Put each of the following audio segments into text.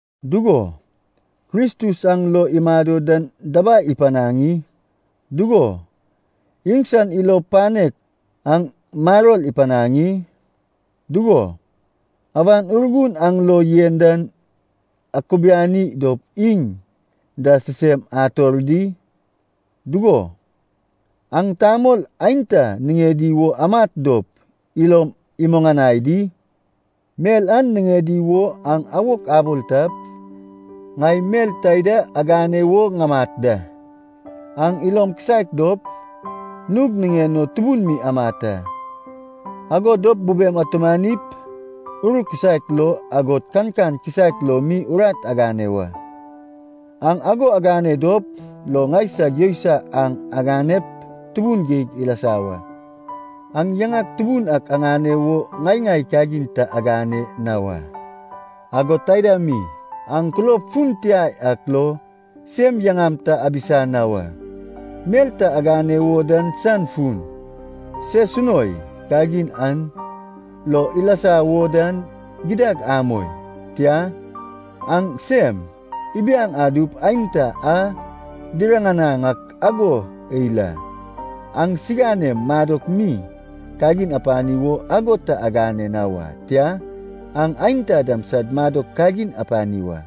Dugo, Kristus aŋ lo imado dan dabai ipanaŋ i? Dugo, iŋsan ilo panek aŋ maror ipanaŋ i? Dugo, Awan Urgun aŋ lo yen dan akubiani dop iŋ da sisem ator di? Dugo, aŋ tamol aenta niŋedi wo amat dop ilom imuŋanai di? Mel an niŋedi wo aŋ awok abol tap, ŋai mel taida agane wo ŋamat da. Aŋ ilom kisaek dop, nug niŋen o tubun mi amat a. Ago dop bubem atumanip ur kisaek lo, agod kankan kisaek lo mi urat agane wa. Aŋ ago agane dop lo ŋaisag yousai an aganep tubun geig ilasa wa. Aŋ yaŋak tubun ak aŋane wo ŋai-ŋai kagin ta agane na wa, agod taida mi, aŋ kulob fun tia yak lo sem yaŋam ta abisa na wa. Mel ta agane wo dan san fun, sesunoi kagin an lo ilasa wo dan gidad amoi. Tia, aŋ sem ibiaŋ adup aenta aŋ diriŋanaŋ ak ago eil a. Aŋ aŋsiganem madok mi kagin apani wo ago ta agane na wa. Tia, aŋ aenta dam sad madok kagin apani wa.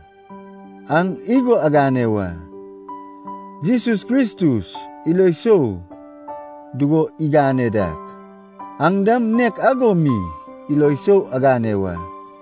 Aŋ igo agane wa. Jesus Kristus ilo sou dugo igane dak, aŋ dam nek ago mi ilo sou agane wa.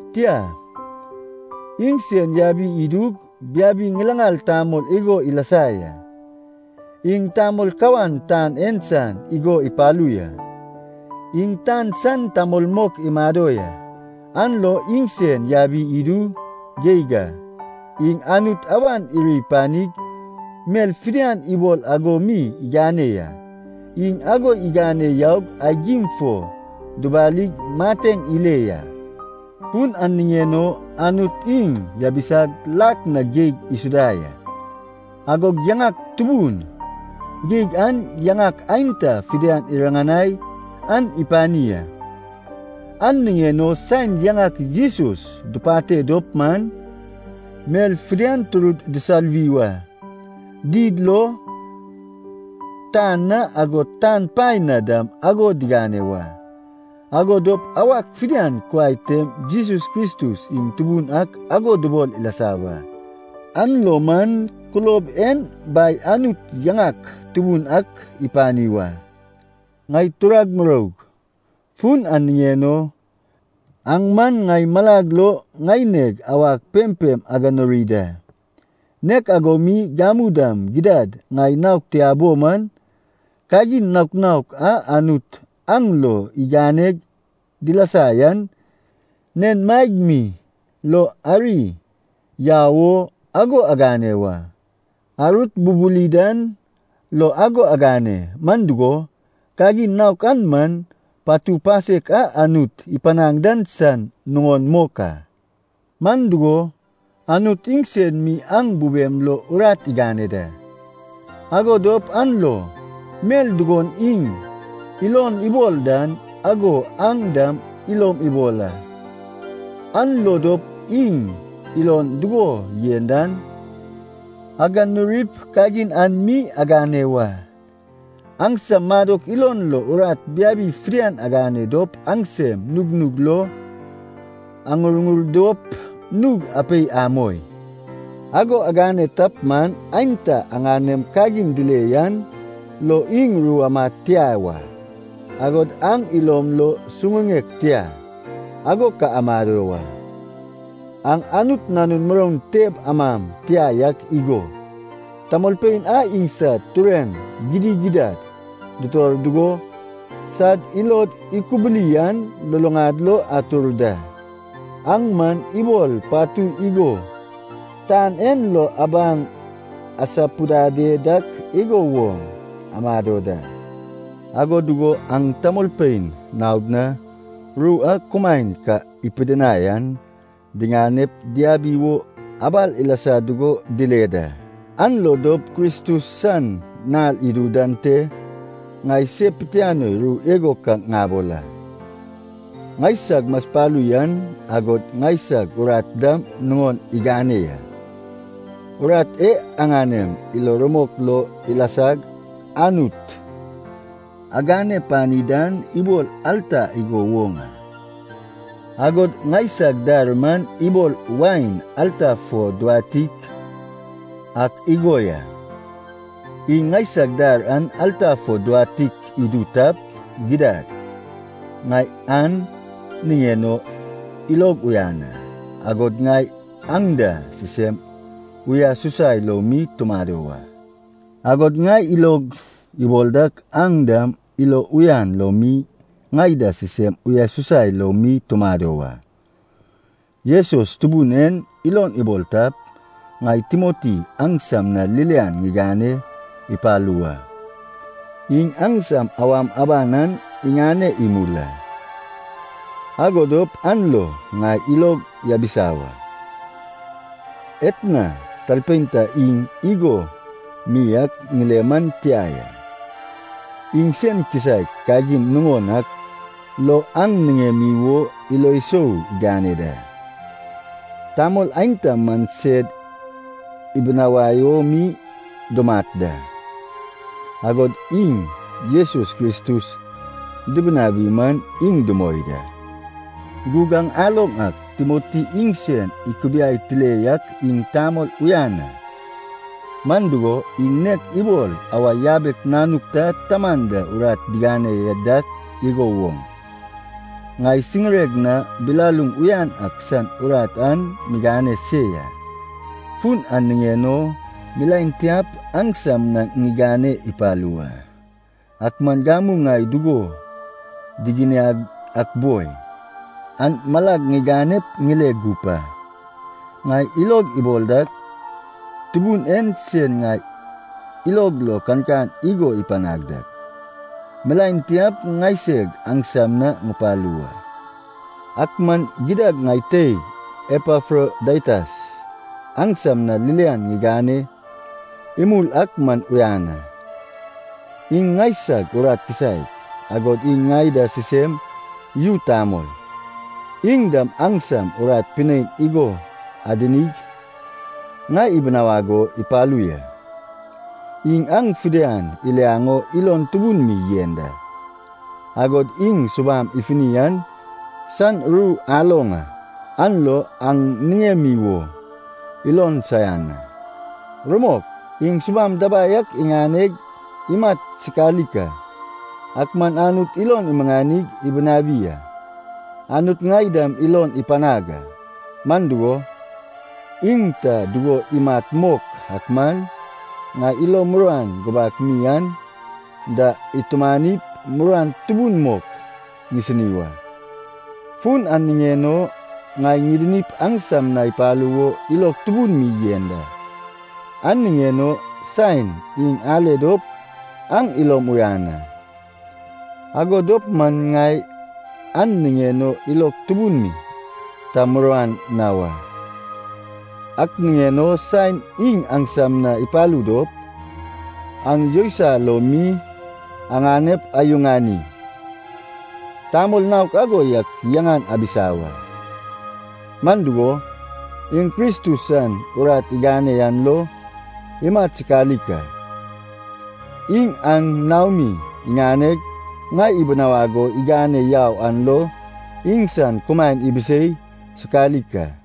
Tia, iŋsen yabi idug biabi ŋilaŋal tamol igo ilasa ya. Iŋ tamol kawan tan en san igo ipalu ya. Iŋ tan san tamol mok imado ya, an lo iŋsen yabi idu geig a. Iŋ Anut awan iri panig mel fidian ibol ago mi igane ya, iŋ ago igane yaug aigim fo dubalig mateŋ ile ya. Fun an niŋen o Anut iŋ yabisag lak na geig isuda ya, agog yaŋak tubun geig an yaŋak aenta fidian iriŋanai an ipani a. An niŋen o saen yaŋak Jesus dupate dop man, mel fidian turud disaluwi wa, did lo, tan na agod tan paen na dam ago digane wa. Ago dop awak fidian kuai tem Jesus Kristus iŋ Tubun ak ago dubol ilasa wa. An lo man kulob en Bai Anut yaŋak tubun ak ipani wa. Ŋai turag muroug, fun an niŋen o, aŋ man ŋai malag lo ŋaineg awag pempem aganuri da. Nek ago mi gamu dam gidad ŋai naog tia bo man, kagin naok naok a Anut aŋ lo iganeg dilasa yan, nen maeg mi lo ari yau o ago agane wa. Arut bubuli dan lo ago agane, man dugo, kagin naok an man, patu pasek a Anut ipanaŋ dan san nuŋon mok a. Man dugo, Anut iŋsen mi aŋ bubem lo urat igane da, ago dop an lo mel dugon iŋ ilon ibol dan ago aŋ dam ilom ibol a, an lo dop iŋ ilon dugo yen dan aganurip kagin an mi agane wa. Aŋsam madok ilon lo urat biabi fidian agane dop aŋsem nugnug lo aŋurŋur dop nug apei amoi. Ago agane tap man aenta aŋanem kagin dile yan lo iŋ ru amad tia wa, agod aŋ ilom lo suŋuŋek tia, ago ka amado wa. Aŋ Anut nanun muroun teb amam tia yak igo, tamolpein a iŋsad tureŋ gidigidad dutor dugo sad ilod ikubili an luluŋad lo atur da. Aŋ man ibol patui igo tan en lo abaŋ asapudade dak igo woŋ amado da, ago dugo aŋ tamolpein naod na, ru a kumaen ka ipidinai an diŋanep diabi wo abal ilasa dugo dile da. An lo dop Kristus san nal idu dan te ŋai se pitianoi ru igo ka ŋabol a, ŋaisag maspalu yan, agod ŋaisag urat dam nuŋon igane ya. Urat e aŋanem ilo rumok lo ilasag Anut agane pani dan ibol alta igo woŋ a. Agod ŋaisag dar man ibol wain alta fo duwatik ak igo ya. Iŋ ŋaisag dar an alta fo duwatik idu tap, gidad, ŋai an niŋen o ilog uyan a, agod ŋai aŋ da sisem uyasusai lo mi tumado wa. Agod ŋai ilog ibol dak aŋ dam ilo uyan lo mi ŋai da sisem uyasusai lo mi tumado wa. Jesus Tubun en ilon ibol tap, ŋai Timoti aŋsam na ririan ŋigane ipalu wa. Iŋ aŋsam awam aban an iŋane imul a, ago dop an lo ŋai ilog yabisa wa. Etna talpein ta iŋ igo mi ak ŋile man tia ya. Iŋ sen kisaek kagin nuŋon ak lo aŋ niŋemi wo ilo sou igane da. Tamol aenta man sed ibinawai o mi dumat da, agod iŋ Jesus Kristus dibinawi man iŋ dumoi da. Gug aŋ aloŋ ak Timoti iŋsen ikubiai tile yak iŋ tamol uyan a. Man dugo, iŋ nek ibol awa yabek nanuk ta taman da urat digane dak igo woŋ, ŋai siŋireg na bilaluŋ uyan ak san urat an migane se ya. Fun an niŋen o milaen tiap aŋsam na ŋigane ipalu wa. Ak man gamu ŋai dugo diginiag ak boi, an malag ŋiganep ŋile gup a. Ŋai ilog ibol dak, Tubun en sen ŋai ilog lo kankan igo ipanag dak, milaen tiap ŋaiseg aŋsam na ŋupalu wa. Ak man gidad ŋai teig Epafrodaitas, aŋsam na ririan ŋigane imul ak man uyan a. Iŋ ŋaisag urat kisaek, agod iŋ ŋai da sisem yu tamol. Iŋ dam aŋsam urat pinein igo adinig ŋai ibinawag o ipalu ya. Iŋ aŋ fidian iliaŋ o ilon tubun mi yen da. Agod iŋ subam ifuni an san ru aloŋ a, an lo aŋ niŋemi wo ilon saian a. Rumok, iŋ subam dabai ak iŋaneg imat sikalik a. Ak man Anut ilon imuŋanig ibinawi a. Anut ŋai dam ilon ipanag a, man dugo, iŋ ta dugo imat mok ak man ŋai ilo muruan gubak mi an da itumanip muruan tubun mok ŋisini wa. Fun an niŋen o, ŋai ŋidinip aŋsam na ipalu wo ilog tubun mi yen da. An niŋen o saen iŋ ale dop aŋ ilom uyan a, ago dop man ŋai an niŋen o ilog tubun mi ta muruan na wa. Ak niŋen o saen iŋ aŋsam na ipalu dop, aŋ yousai lo mi aŋanep ayuŋani. Tamol naok ago yak yaŋan abisa wa. Man dugo, iŋ Kristus san urat igane an lo imat sikalik a. Iŋ aŋ naomi iŋaneg ŋai ibinawag o igane yau an lo iŋsan kumaen ibisei sikalik a.